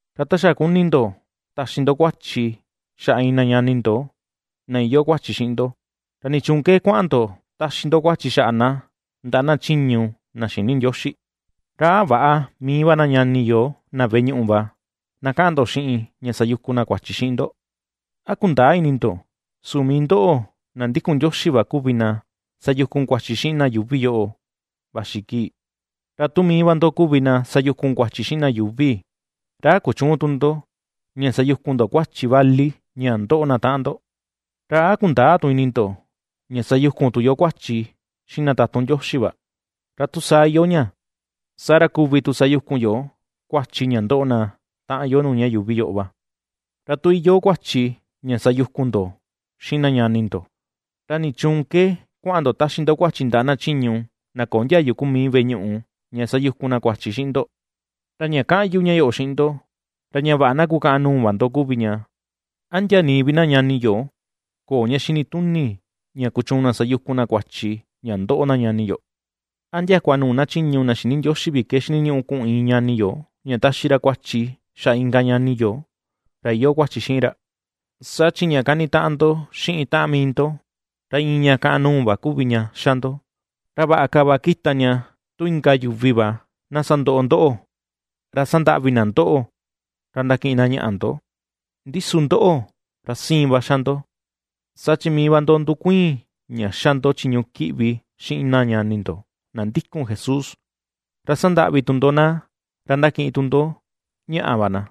Ra ta xa kuni ndo taxi ndo kuachi xaꞌa iin na ñani ndo na iyoo kuachi xiꞌin ndo, ¿ra nichuun ke kuaꞌan ndo ^taxi ndo kuachi xaꞌa na ndaꞌa na chiñu na xïni Ndioxi? ¿Ra a väꞌa mii na ñani yo na veꞌe ñuꞌu va, na kaꞌan ndo xiꞌin ña sayukun na kuachi xiꞌin ndo? ¿A kundäa ini ndo su mii ndoꞌo na ndikun Ndioxi va kuvi na sayukun kuachi xiꞌin na yuuvi yoꞌo vaxi kii? Ra tu mii va ndo kuvi na sayukun kuachi xiꞌin na yuuvi, ¿ra a kuchüun tu ndo ña sayukun ndo kuachi vali ña ndoꞌo na taꞌan ndo? ¿Ra a kundäa tu ini ndo ña sayukun tu yo kuachi xiꞌin na tatun Ndioxi va? Ra tu saa iyoo ña, ¡saa ra kuvi tu sayukun yo kuachi ña ndoꞌo na taꞌan yo nuu ña yuuvi yoꞌo va! Ra tu iyoo kuachi ña sayukun ndo xiꞌin na ñani ndo, ¿ra nichuun ke kuaꞌan ndo ^taxi ndo kuachi ndaꞌa na chiñu na köo ndiayu kuu mii veꞌe ñuꞌu ña sayukun na kuachi xiꞌin ndo? Ra ña kaꞌan yu ña yoꞌo xiꞌin ndo, ra ña vaꞌa na kukaꞌan nuu va ndo kuvi ña. ¿A ndia nii vi na ñani yo köo ña xini tuni ña kuchuun na sayukun na kuachi ña ndoꞌo na ñani yo? ¿A ndiakua nuu na chiñu na xïni Ndioxi vi ke xiniñuꞌu kuꞌun iin ñani yo, ña taxi ra kuachi xaꞌa inka ñani yo ra iyoo kuachi xiꞌin ra? Saa chi ña kanitaꞌan ndo xiꞌin taꞌan mii ndo, ra iin ña kaꞌan nuu va kuvi ña xa ndo. Ra vaꞌa ka va kita ña tu inka yuvi va na sandoꞌo ndoꞌo, ra sandaꞌvi na ndoꞌo, ra ndakiꞌin na ñaꞌa ndo, ndi su ndoꞌo, ra siin va xa ndo. Saa chi mii va ndo ndukuiin ña ^xa ndo chiñu kiꞌvi xiꞌin na ñani ndo na ndikun Jesús, ra sandaꞌvi tu ndo na ra ^ndakiꞌin tu ndo ñaꞌa va na.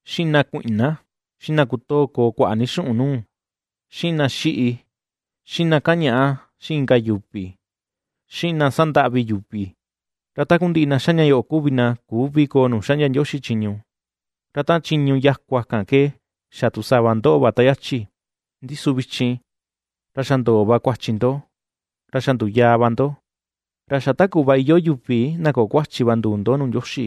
xiꞌin na kuiꞌna, xiꞌin na kutoo koo kuaꞌa ni xuꞌun nuu, xiꞌin na xíꞌí, xiꞌin na kañaꞌa xiꞌin inka yuvi, xiꞌin na sandaꞌvi yuvi. Ra takundiꞌi na ^xa ña yoꞌo kuvi na küvi koo nuu xaꞌndia Ndioxi chiñu. Ra taꞌan chiñu yakua kan ke xa tu sava ndoꞌo va ta yachi; ndi su vichin ra xa ndoo va kuachi ndo, ra xa nduyaa va ndo. Ra xa ta kuꞌva iyoo yuvi na köo kuachi va nduu ndo nuu Ndioxi,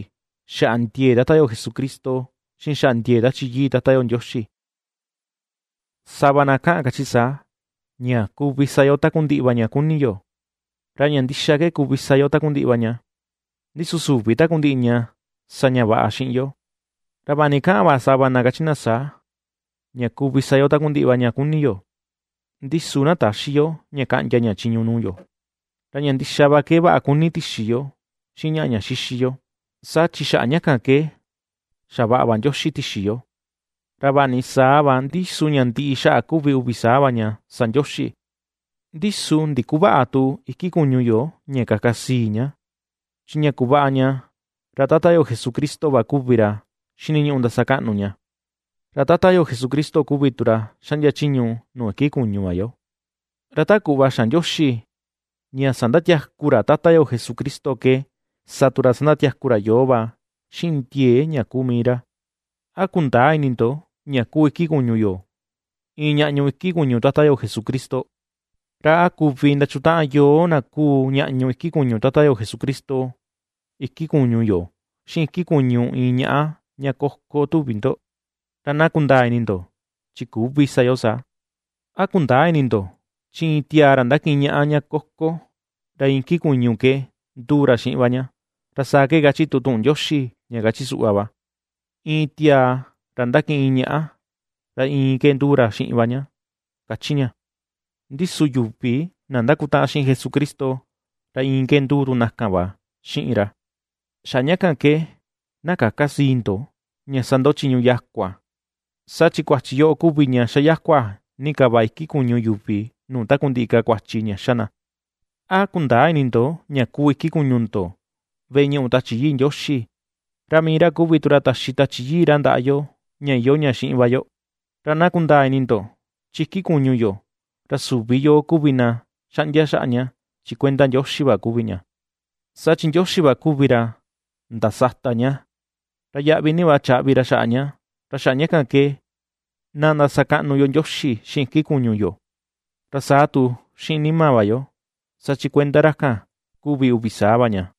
xaꞌa ndiee Tata yo Jesucristo, xiꞌin xaꞌa ndiee Tachi Yii Tata yo Ndioxi. Sava na kaꞌan kachi saa: “Ña kuvi sa yo takundiꞌi va ña kuni yo.” Ra ña ndixa ke kuvi sa yo takundiꞌi va ña, ndi su süvi takundiꞌi ña sa ña vaꞌa xiꞌin yo; ra vaꞌa ni kaꞌan va sava kachi na saa: “Ña kuvi sa yo takundiꞌi va ña kuni yo”, ndi su na täxi yo ña kaꞌndia ña chiñu nuu yo. Ra ña ndixa va ke vaꞌa kuni tixi yo xiꞌin ñaꞌa ña xixi yo, saa chi xaꞌa ña kan ke xavaꞌa va Ndioxi tixi yo. Ra vaꞌa ni saa va, ndi su ña ndiꞌi xaꞌa kuvi uvi saa va ña sa Ndioxi. Ndi su ndikuväꞌa tu iki kuñu yo ña kaka sii ni ña; chi ña kuvaꞌa ña, ra Tata yo Jesucristo va kuvi ra xiniñuꞌu ndasakaꞌnu ña, ra Tata yo Jesucristo kuvi tu ra xaꞌndia chiñu nuu iki kuñu va yo. Ra ta kuꞌva xa̱ Ndioxi ña sandatiaku ra Tata yo Jesucristo ke, sa tu ra ña sandatiaku ra yoo va xiꞌin ndiee ña kuu mii ra. ¿A kundäa ini ndo ña kuu iki kuñu yo iin ñaꞌñu iki kuñu Tata yo Jesucristo? ¿Ra a kuvi ndachutaꞌan yoo na kuu ñaꞌñu iki kuñu Tata yo Jesucristo iki kuñu yo, xiꞌin iki kuñu iin ñaꞌa ña koko tuvi ndo? ¡Ra na kundaa ini ndo, chi küvi sa yo saa! ¿A kundäa ini ndo, chi iin tiaa ra ndakiꞌin ñaꞌa ña koko, ra iin iki kuñu ke nduu ra xiꞌin va ña? Ra saa kachi tu tuꞌun Ndioxi ña kachi suꞌva va: “Iin tiaa ra ndakiꞌin iin ñaꞌa, ra iin ke nduu ra xiꞌin va ña”, ^kachi ña. Ndi su yuvi na ndakutaꞌan xiꞌin Jesucristo, ra iin ke nduu tu na kan va xiꞌin ra. Xaꞌa ña kan ke, na käka sii ndo, ña sa ndo chiñu yakua. Saa chi kuachi yoꞌo kuvi ña xayakua ni ka va iki kuñu yuvi nuu takundiꞌi ka kuachi ña ^xa na. ¿A kundäa ini ndo ña kuu iki kuñu ndo, veꞌe ñuꞌu Tachi Yii Ndioxi, ra mii ra kuvi tu ra taxi Tachi Yii ra ndaꞌa yo ña iyoo xiꞌin va yo? Ra na kundaa ini ndo, chi iki kuñu yo, ra süvi yoo kuvi na xaꞌndia xaꞌa ña, chi kuenda Ndioxi va kuvi ña. Saa chi Ndioxi va kuvi ra ndasata ña, ra yaꞌvi ni va chaꞌvi ra ña. Ra xaꞌa ña kan ke na ndasakaꞌnu yo Ndioxi xiꞌin iki kuñu yo, ra saa tu xiꞌin nima va yo, saa chi kuenda ra kan kuvi uvi saa va ña.